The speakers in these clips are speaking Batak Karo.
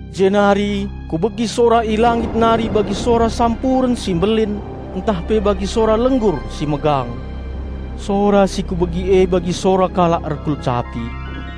Jenari kubegi sora i langit nari bagi sora sampuren si mbelin ntah pe bagi sora lenggur si megang. Sora si kubegi e bagi sora kalak erkulcapi.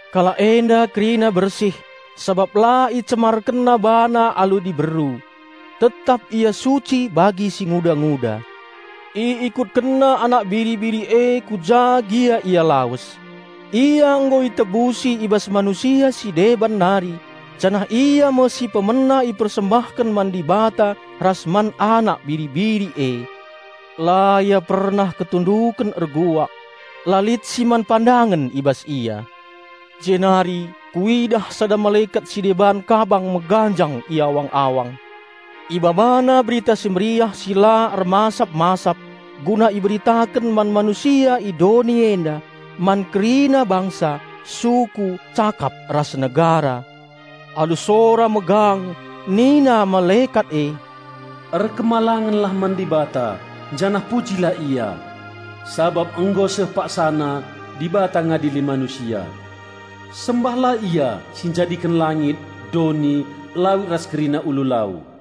Kalak enda kerina bersih sabap la icemarkenna bana alu diberu. Tetap ia suci bagi singuda-nguda. Iikutkenna Anak Biri-biri e ku ja gia Ia lawes. Ia nggo itukur i bas manusia si deban nari, janah ia me si pemena ipersembahken man Dibata ras man Anak Biri-biri e. La ia pernah ketunduken erbual. La lit si man pandangen i bas ia. Jenari kuidah sada malekat si deban kabang meganjang i awang-awang. Ibabana Berita Si Mehuli si la ermasap-masap guna iberitaken man manusia i doni enda, man kerina bangsa, suku, cakap ras negara. Alu sora megang nina malekat e, "Erkemalangenlah man Dibata janah pujilah Ia. Sabap nggo seh paksana Dibata ngadili manusia. Sembahlah Ia si njadiken langit, doni, lawit ras kerina ulu lau!"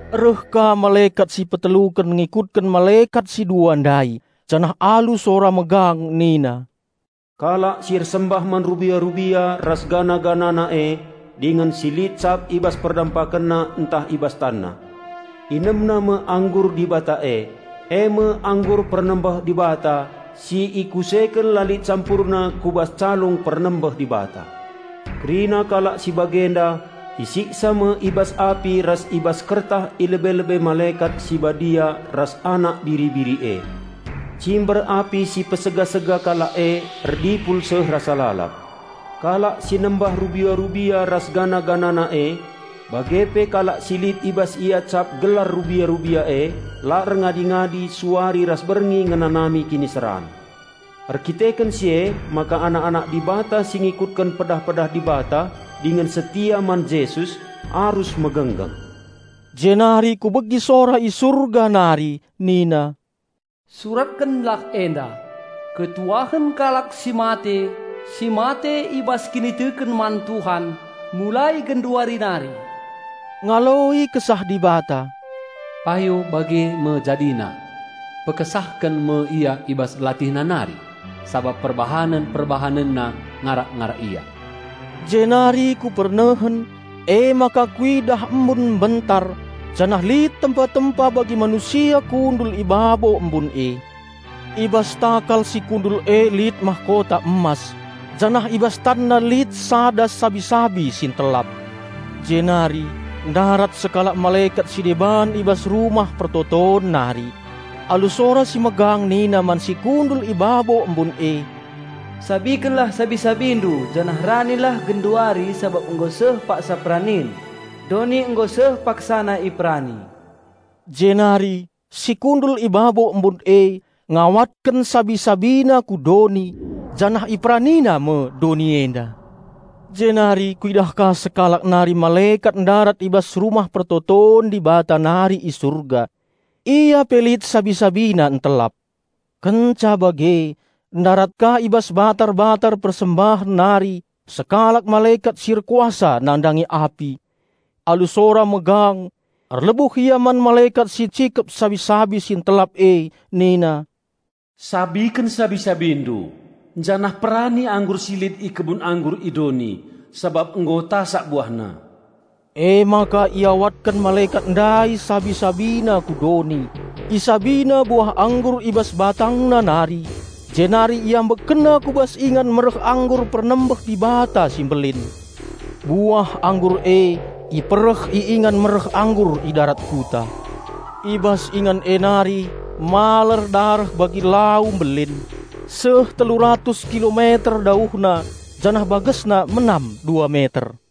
Reh ka malekat si peteluken ngikutken malekat si dua ndai janah alu sora megang nina, "Kalak si ersembah man rubia-rubia ras patungna e, dingen si lit cap i bas perdempakenna ntah i bas tanna, inemna me anggur Dibata e, eme anggur pernembeh Dibata si ikuseken la lit campurna ku bas calung pernembeh Dibata. Kerina kalak si bagenda, isiksa me i bas api ras i bas kertah i lebe-lebe malekat si Badia ras Anak Biri-biri e. Cimber api si niksa kalak e erdipul seh rasa lalap. Kalak si nembah rubia-rubia ras patungna e, bage pe kalak si lit i bas ia cap gelar rubia-rubia e, la erngadi-ngadi, suari ras berngi ngenanami kiniseran." Erdandanken si emaka anak-anak Dibata si ngikutken pedah-pedah Dibata dingen setia man Jesus arus megenggeng. Jenari kubegi sora i Surga nari nina, "Suratkenlah enda, 'Malem me ate kalak si mate, si mate i bas kiniteken man Tuhan, mulai genduari nari!' Ngaloi Kesah Dibata, 'Payo bageme jadina!' Pekesahken me ia i bas latihna nari, sabap perbahanen-perbahanenna ngarak-ngarak ia." Jenari kunehen, kuidah embun mbentar, janah lit tempa-tempa bagi manusia kundul i babo embun e. I bas takal si kundul e lit mahkota emas janah i bas tanna lit sada sabi-sabi si ntelap. Jenari ndarat sekalak malekat si deban i bas Rumah Pertoton nari. Alu sora si megang nina man si kundul i babo embun e, "Sabikenlah sabi-sabindu janah ranilah genduari sabap nggo seh paksa peranin, doni nggo seh paksana iperani!" Jenari iawatken si kundul i babo embun e sabi-sabina ku doni, janah merani me doni enda. Jenari kuidah ka sekalak nari malekat ndarat i bas Rumah Pertoton Dibata nari i Surga. Ia pe lit sabi-sabina ntelap. Kenca bage ndarat ka i bas batar-batar persembahen nari sekalak malekat si erkuasa nandangi api. Alu sora megang erlebuh ia man malekat si ncikep sabi-sabi si ntelap e nina, "Sabiken sabi-sabindu, janah perani anggur si lit i kebun anggur i doni, sabap nggo tasak buahna!" Emaka iawatken malekat ndai sabi-sabina ku doni, isabina buah anggur i bas batangna nari, jenari iambekkenna ku bas ingan mereh anggur pernembeh Dibata si mbelin. Buah anggur e ipereh i ingan mereh anggur i darat kuta. I bas ingan e nari maler dareh bagi lau mbelin, seh telu ratus kilometer dauhna janah bagesna menam dua meter.